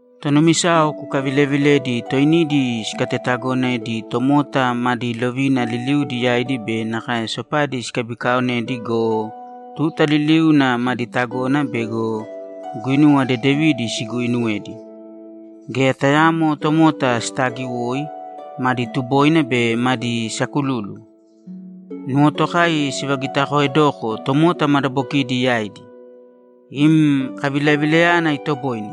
Tonumisayao kukavilevilēdi toinidi sikatetagonedi tomota madi lovina liliudi yaidi be nakae sopadi sikabikaonedi go, tuta liliuna madi tagona bego guinuwa dedevidi siguuinuwedi. Geya tayaamo tomota sitaagiwoi, madi tuboina be madi sakululu. Nuwotokai sivagitakoedoko tomota madabokidi yaidi. Im kavilavilayana itoboine.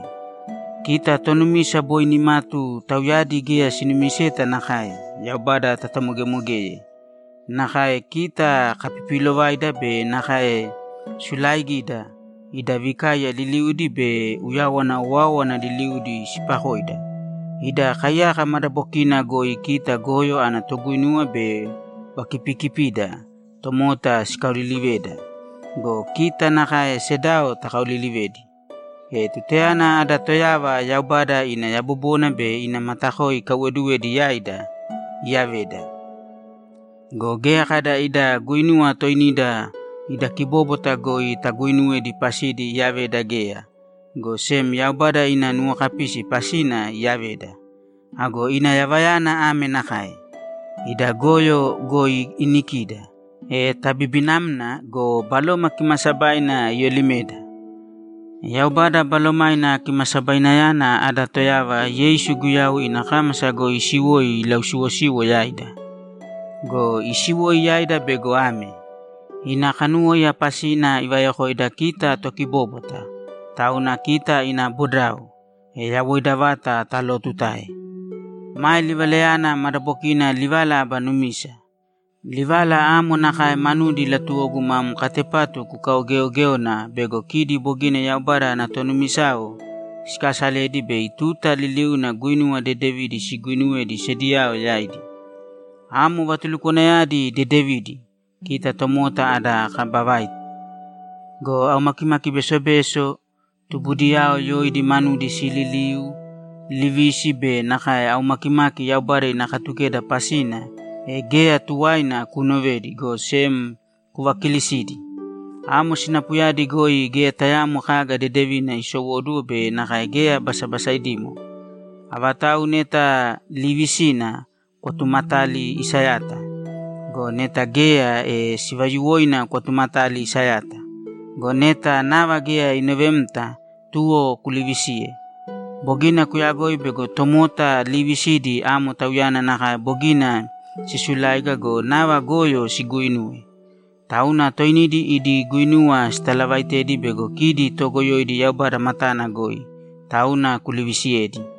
Kita tonumisa boi nimatu tauyadi geya sinumiseta nakae, Yaubada tatamogemogeye. Nakae kita kapipiilovaida be nakae sulaaigida, ida vikaiya liliudi be uyawana owáowana liliudi sipakoida, ida kaiyaka madabokina goi kita goyo ana toguinuwa be vakipiikipida, tomota sikaoliliveda go, kita nakae sedao takaolilivedi. E tutayana ada Toyava Yaubada ina yabobona be ina matakoi ikaiwoduwedi yaida, iyaveda. Go geya kada ida guinuwa toinida ida kibóbwata goi taguuinuwedi pasidi iyaveda geya, go sem Yaubada ina nuwokapisi pasina iyaveda. Ago ina yavayana ame nakae: Ida goyo goi inikida, e tabibinamna go, Baloma Kimaasabaina iyolimeda. Yaubada Balomaina Kimasabainayana ada Toyava Yeisu Guyau ina kámasa goi isiwoi ilausiwosiwo yaida. Go isiwoi yaida bego ame: Ina kanuwóiya pasina ivayokoida kita tokibóbwata, tauna kita ina bodao, e yawoida vata talootutae. Mae livalayana madabokina livala aba numisa. Livala amo nakae manudi latuwogu mam katepatu kukaugeogéona bego kidi bogina Yaubada ana tonumisayao sikasaledi bei tuta liliuna guinuwa dedevidi siguuinuwedi sediyao yaidi. Amo vatulukwanayadi dedevidi, kita tomota ada kaba vaita. Go aumakimaki besobeso, tubudiyao yoidi manudi sililiu, livisi be nakae aumakimaki Yaubada ina Katukeda pasina, e geya tuwaina kunovēdi, go sem kuvakiilisīdi. Amo sinapuyadi goi geya tayaamo kaga dedevina isowóduwo be nakae geya basabasaidimo. Avatau neta liivisina, kwatumatāli isayata. Go neta geya, e sivayuwoina kwatumatāli isayata. Go neta nava geya inovemta, tuwo kulivisīye. Bogina kuyagoi bego tomota liivisidi amo tauyana nakae bogina sisuláiga go, nava goyo siguuinuwe. Tauna toinidi idi guinuwa sitalavaitedi bego kidi togoyoidi Yaubada matana goi. Tauna kulivisiyēdi.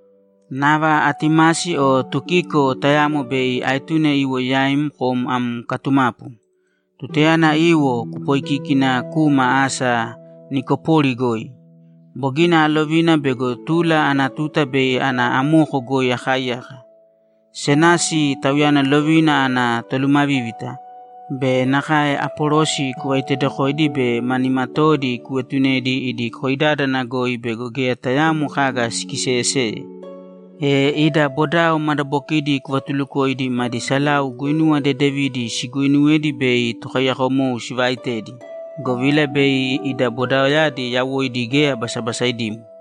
Nava Atimasi o Tukiko, tayamo bei aetune iwo yaim kom am katumapu. Tutayana iwo, kupoikīkina kūma asa Nikopori goi. Bogina alovina bego tula ana tuta bei ana amoko goi akaaiyaka. Senasi, tauyana lovina ana tolumavívita, be nakae Apolosi kuvaitedokōidi be ma nimatoodi kuetunēdi idi koidádana goi bego geya tayaamo kaga sikiseyeseye. E ida bodao madabokidi kuvatulukōidi madi salau guinuwa dedevidi siguuinuwedi bei tokaiyakomou sivaaitedi, govila bei ida bodaoyadi yawoidi geya basabasaidimo.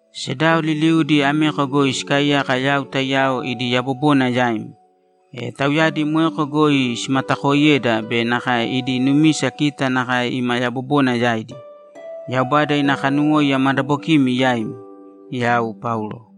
Sedao liliudi ameko goi sikaaiyaka yau taiyao idi yabobona yaim. E tauyadi moeko goi simatakooiyeda be nakae idi numisa kita nakae ima yabobona yaidi. Yaubada ina kanuwóiya madabokimi yaimi! Yau Paulo